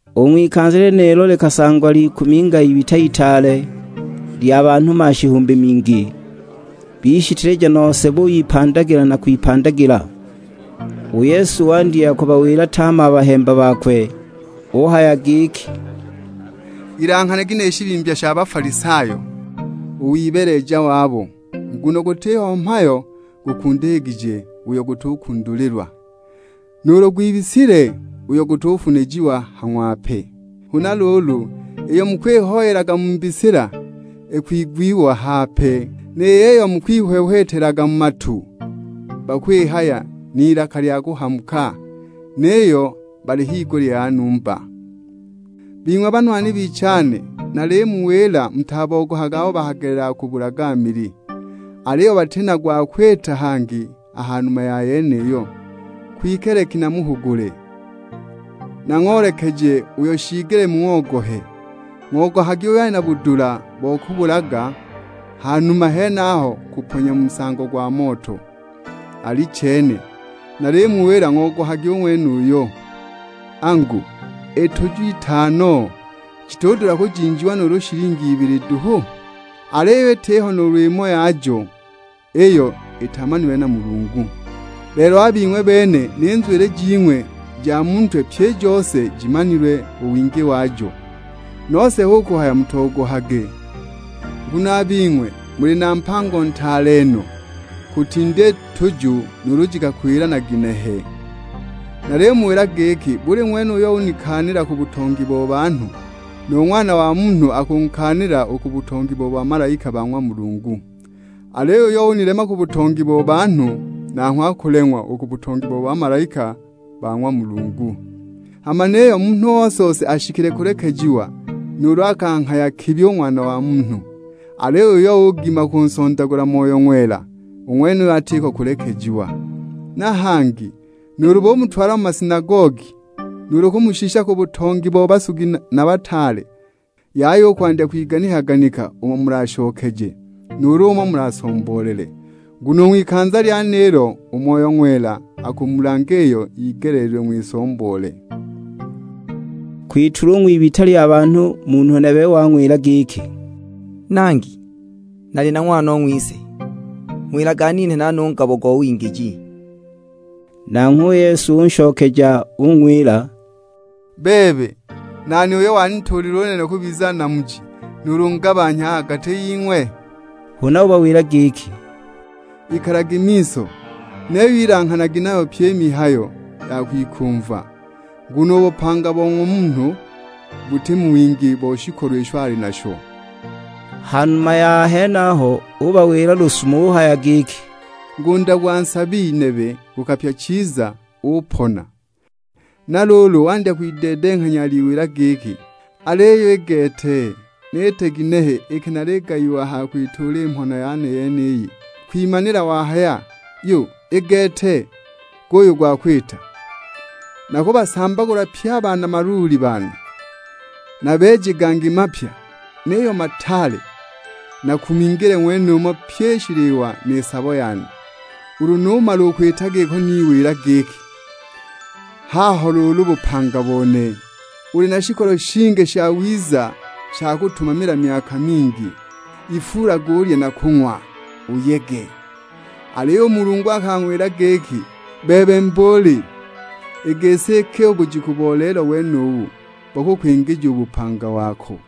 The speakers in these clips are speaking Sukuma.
U ng'wikanza lyenilo likasangwa likuminga ibita itaale, lya banhu mashihumbi mingi; bishiteleja nose buyipandagila na kwipandagila. U Yesu wandya kubawila tame a bahemba bakwe; uhaya giki, "Ilanghanagi ni shibimbya sha Bafalisayo, u wibeeleja wabo. Nguno gutiho mhayo gukundikigije, uyo gutukundulilwa; nuulu gwibisile, uyo gutufunijiwa ha ng'wape. Huna luulu, iyo mukwihoyelaga mu mbisila ikwigwiwa hape; ni yiyo mukwihwehwetelaga mu matu, bakwihaya n'ilaka lya kuhamuka, niyo bali higulya ya numba!" "Bing'we banwani bichane, nalimuwila mutabogohage abo bakagelelaga kubulaga mili, aliyo bati na gwa kwita hangi a ha numa ya yeniyo. Kwike leki namuhugule, nang'oolekeje uyo shiigelile mung'ogohe. Ng'ogohagi uyo ali na budula bo kubulaga, ha numa ya henaho kuponya mu nsango gwa moto; alichene, nalimuwila ng'ogohagi u ng'wenuyo! Angu, i tuju ij'itano jitudula kujinjiwa nuulu shilingi ibili duhu? Aliyo itiho nuulu imo yajo iyo itamanilwe na Mulungu. Lelo a bing'we bene ni nzwili jing'we i ja mu ntwe pyi i jose jimanilwe u wingi wajo. Nose hu kuhaya mutogohage, nguno a bing'we muli ba mpango ntaale no, kutinda i tuju nuulu jikakwila na ginehe!" "Nalimuwila giki buli ng'wene uyo unikaanila ku butongi bo banhu, nu Ng'wana wa Munhu akunkaanila u ku butongi bo bamalaika ba ng'wa Mulungu. Aliyo uyo unilema ku butongi bo banhu, nanghwe akuleng'wa u ku butongi bo bamalaika ba ng'wa Mulungu. Hama niyo munhu ose-ose ashikile kulekejiwa nuulu akanghaya kibi u Ng'wana wa Munhu, aliyo uyo ugima kunsondagula Moyo Ng'wela, u ng'wenuyo atiko u kulekejiwa. Na hangi nuulu bumutwala mu masinagogi, nuulu kumushisha ku butongi bo basugi na bataale, yaya u kwandya kwiganika-ganika umo mulashokeje, nuulu umo mulasomboolele. Nguno u ng'wikanza lyenilo u Moyo Ng'wela akumulanga iyo yigeleelilwe ng'wisomboole." Kwitulwa u ng'wibita lya banhu, munhu nebe wang'wila giki, "Nangi, nali na ng'wanong'wise, ng'wilage aninhe nane u ngabo go wingiji!" Nanghwe u Yesu unshokeja ung'wila, "Bebe, nani uyo wanituulile u nene kubiza namuji nuulu ngabanhya a ha gati ying'we?" Huna ubawila giki, "Ikalagi miso; niyo ilanghanagi nayo pyi i mihayo ya kwikumva, nguno u bupanga bo ng'wa munhu buti mu wingi bo shikolo isho ali nasho." Ha numa ya henaho ubawila lusumo uhaya giki, "Ngunda gwa nsabi nebe gukapya chiza, upona. Na luulu wandya kwideedenghanya aliwila giki, 'Aliyo i gete, niite ginehe iki naligayiwa a ha kwituula i mhona yane yeniyi!' Kwimanila ohaya, 'Yu, i gete guyu u gwa kwita: nakubasambagula pye a bana maluuli bane, nabeeje gangi mapya, niyo mataale; nakumingile ng'wenumo pyi i shiliwa ni sabo yane. Ulu numala u kwita giko niwila giki, "Haho luulu bupanga bone, uli na shikolo shingi shawiza sha kutumamila myaka mingi; ifuulage ulye na kung'wa, uyege!" ' Aliyo u Mulungu akang'wila giki, 'Bebe mbuuli, i gisi iki u bujiku bo lelo wenubu bakukwingija u bupanga wako,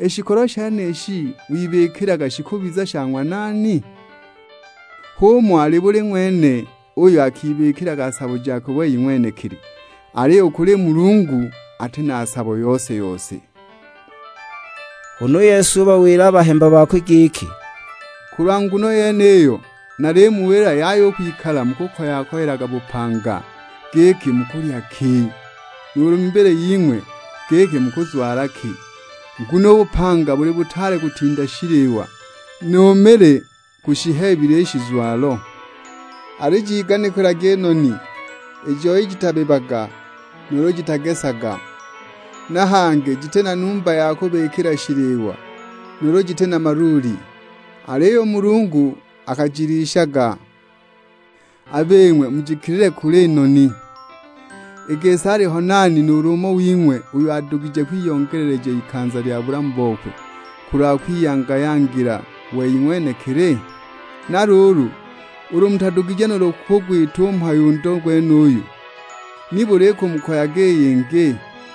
i shikolo shenishi wibikilaga shikubiza sha ng'wa nani?' H'umo ali buli ng'wene uyo akibikilaga sabo jakwe wei ng'wenekili, aliyo u kuli Mulungu ati na sabo yose-yose!" Huna u Yesu ubawila a bahemba bakwe giki, "Kulwa nguno yeniyo nalimuwila yaya u kwikala mukukoya-koyelaga bupanga, giki mukulya ki, nuulu mibili ying'we, giki mukuzwala ki! Nguno u bupanga buli butaale kutinda shiliwa, nu mili gushiheebile i shizwalo. Alijiganikilagi i noni, i joi jitabibaga nuulu jitagesaga, na hangi jiti na numba ya kubikila shiliwa, nuulu jiti na maluuli; aliyo u Mulungu akajilishaga. A bing'we mujikilile kule no i noni! I gisi aliho nani nuulu umo wing'we uyo adugije kwiyongeleleja i likanza lya bulamu bokwe kulwa kwiyanga-yangila wei ng'wenekili? Na luulu ulu mutadugije nuulu kugwita u mhayo u ndo gwenuyu, nibuli ikumukoyaga i yingi?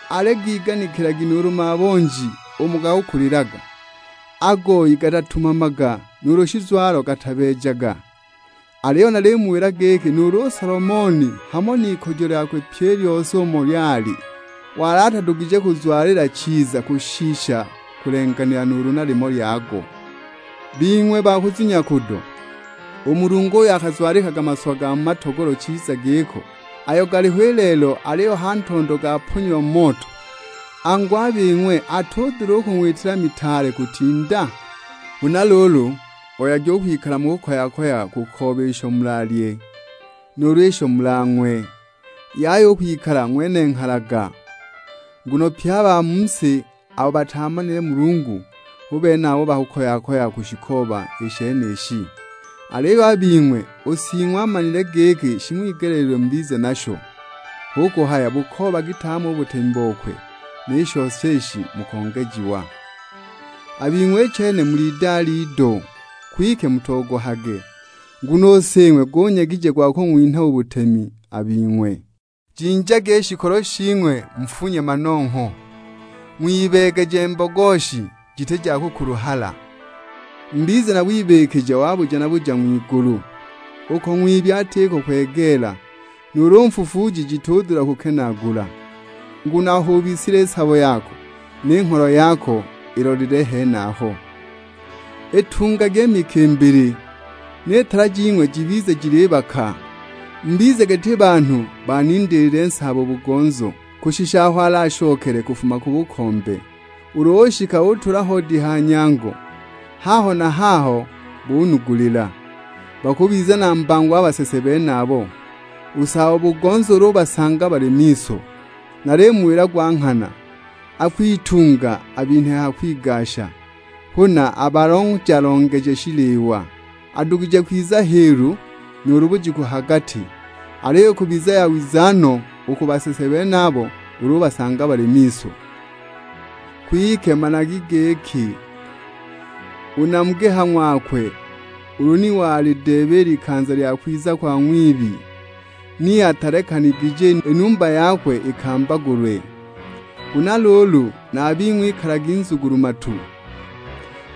Aligiganikilagi nuulu mabonji umo gakakulilaga; a goyi gatatumamaga, nuulu shizwalo gatabeejaga; aliyo nalimuwila giki nuulu u Solomoni hamo n'ikujo lyakwe pyi i lyose umo lyali, wali atadugije kuzwalila chiza kushisha kulenganila nuulu na limo lyago. Bing'we ba kuzunya kudo, u Mulungu uyo akazwalikaga maswa ga mu matogolo chiza giko, ayo galiho i lelo aliyo a ha ntondo gaponyiwa mu moto, angu a bing'we atudula kung'witila mitaale kutinda? Huna luulu, oyagi u kwikala mukukoya-koyaga kukooba isho mulalye, nuulu isho mulang'we; yaya u kwikala ng'wenenghalaga. Nguno pye a ba mu si abo bataamanile Mulungu hu bene abo bakakoya-koyaga kushikooba i shenishi; aliyo a bing'we, u Sing'we amanile giki shing'wigeleelilwe mubize nasho. Hu kuhaya bukoobagi tame u butemi bokwe, ni shose ishi mukongejiwa." "A bing'we i chene muli idale ido, kwike mutogohage, nguno u Sing'we gunyegije gwa kung'winha u butemi a bing'we. Jinjagi i shikolo shing'we mufunye manongho, ng'wibeegeje mbogoshi jiti ja kukuluhala; mubize na wibikija wa buja na buja ng'wigulu, uko ng'wibi atiko kwegeela, nuulu fufuuji jitudula kukenaagula. Nguno aho ubisilile i sabo yako, ni ngholo yako ilolelile henaho." "Itungagi i mikimbili, ni tala jing'we jibize jilibaka. Mubize giti banhu banindiilile saabo-bugonzo, kushisha aho alashokele kufuma ku bukombe. Ulu ushika utula hoodi ha nyango, haho na haho bunugulila. Bakubiza na mbango a basese benabo, u saabo-bugonzo ulu ubasanga bali miso; nalimuwila gwa nghana, akwitunga abinhe ha kwigasha, huna abalonja-longeje shiliwa. Adugije kwiza hiilu, nuulu bujiku ha gati, aliyo ikubiza yawiza no u ku basese benabo ulu ubasanga bali miso. Kwike managi giki u namugi ha ng'wakwe ulu ni walideeba i likanza lya kwiza kwa ng'wibi ni atilekanigije i numba yakwe ikambagulwe. Huna luulu, na a bing'we ikalagi nzugulu-matu,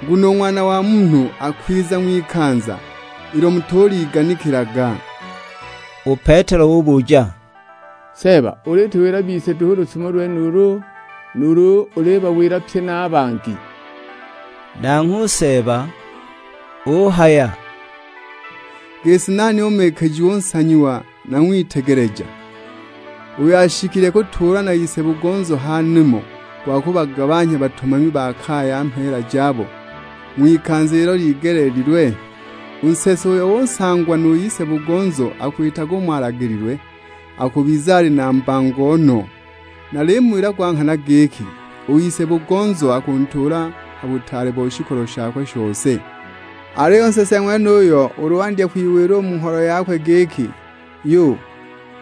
nguno u Ng'wana wa Munhu akwiza ng'wikanza ilo mutuliganikilaga." U Petelo ubuja, "Seeba ulituwila bise duhu u lusumo lwenulu, nuulu ulibawila pye na a bangi?" Nanghwe u Seeba uhaya, "I gisi nani u mikijiwa u nsanyiwa na ng'witegeleja, uyo ashikile kutuulwa na ise-bugonzo ha nimo gwa kubagabanhya batumami ba ha kaya mheela jabo ng'wikanza ilo ligeleelilwe? U nsese uyo usangwa nu ise-bugonzo akwitaga umo alagililwe, akubiza ali na mbango no. Nalimuwila go nghana giki, u ise-bugonzo akuntuula ha butaale bo shikolo shakwe shose. Aliyo u nsese ng'wenuyo ulu wandya kwiwila u mu ngholo yakwe giki, 'Yu,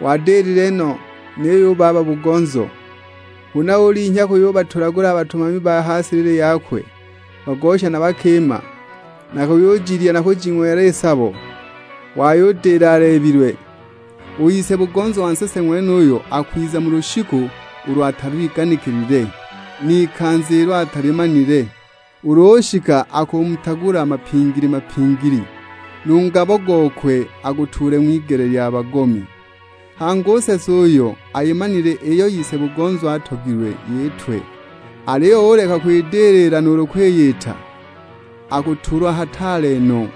wadilile no niyo u baba-bugonzo!' Huna ulinhya kuyubatulagula a batumami ba ha silili yakwe, bagosha na bakima; na kuyujilya na kujing'wela i sabo, wayudila aleebilwe, u ise-bugonzo wa nsese ng'wenuyo akwiza mu lushiku ulo atalwiganikilile, n'ikanza ilo atalimanile. Ulu ushika akumutagula mapingili-mapingili, nu ngabo gokwe agutuule ng'wigele lya bagomi. Hangi u nsese uyo ayimanile iyo ise-bugonzo atogilwe yitwe, aliyo uleka u kwidilila nuulu kwiyita, akutulwa hataale no.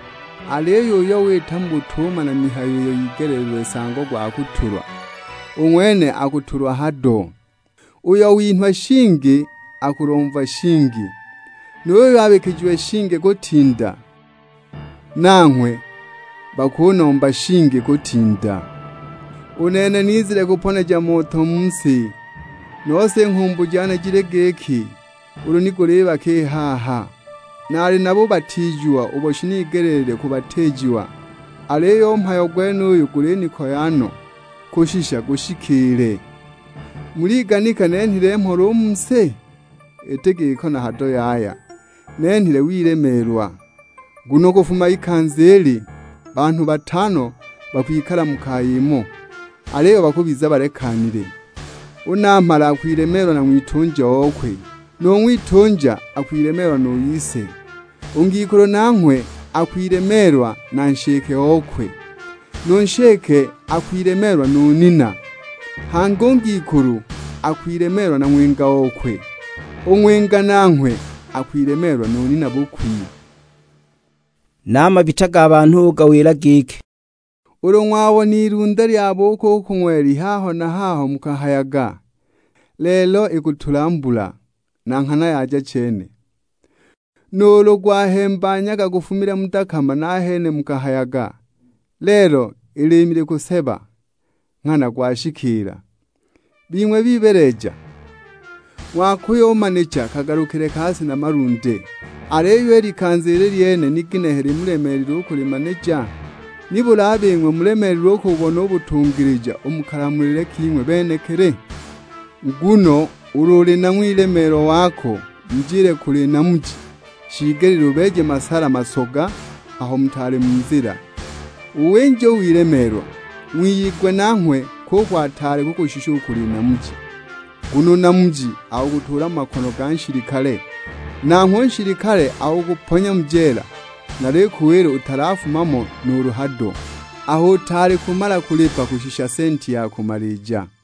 Aliyo uyo wita mu butumana mihayo iyo yigeleelilwe nsango gwa kutulwa, u ng'wene akutulwa hado. Uyo winhwa shingi akulomva shingi, nu yuyo abikijiwe shingi kutinda, nanghwe bakunomba shingi kutinda." "U nene nizile kuponeja moto u mu si, nose i nghumbu jane jili giki ulu ni gulibaka i haha! Nali na bubatiijiwa ubo shinigeleelilwe kubatiijiwa; aliyo u mhayo gwenuyu gulinikoya no kushisha gushikiile! Muliganika nenhile mhola u mu si? Iti giko na hado yaya; nenhile wilemeelwa. Nguno kufuma ikanza ili, banhu batano bakwikala mu kaya imo; aliyo bakubiza balekanile. U namhala akwilemeelwa na ng'witunja okwe, nu ng'witunja akwilemeelwa nu ise; u ngikulu nanghwe akwilemeelwa na nshike okwe, nu nshike akwilemeelwa nu nina. Hangi u ngikulu akwilemeelwa na ng'winga okwe; u ng'winga nanghwe akwilemeelwa nu nina bukwi." Na a mabita ga banhu ugawila giki, "Ulu ng'wabona ilunde lyabuuka u ku ng'weli haho na haho mukahayaga, 'Lelo ikutula mbula;' na nghana yaja chene. Nuulu gwahemba nyaga gufumile mu dakama nahene mukahayaga, 'Lelo i liimi likuseba' nghana gwashikiila. Bing'we bibeeleja, ng'wakuyumanija kagalukile ka si na malunde, aliyo i likanza ili i lyene ni ginehe limulemeelile u kulimanija?" "Nibuli a bing'we mulemeelilwe u kububona u butungilija u mu kalamulile king'we benekili? Nguno ulu uli na ng'wilemeelwa wako mujile kuli namuji, shiigelile ubeeje masala masoga aho mutaali mu nzila, uwinje u wilemeelwa; wiyigwe nanghwe kuko ataali kukushisha u kuli namuji. Nguno u namuji akukutuula mu makono ga nshilikale, nanghwe u nshilikale akukuponya mu jeela. Nalikuwila utalafuma mo nuulu hado, aho utaali kumala kulipa kushisha senti ya kumalija."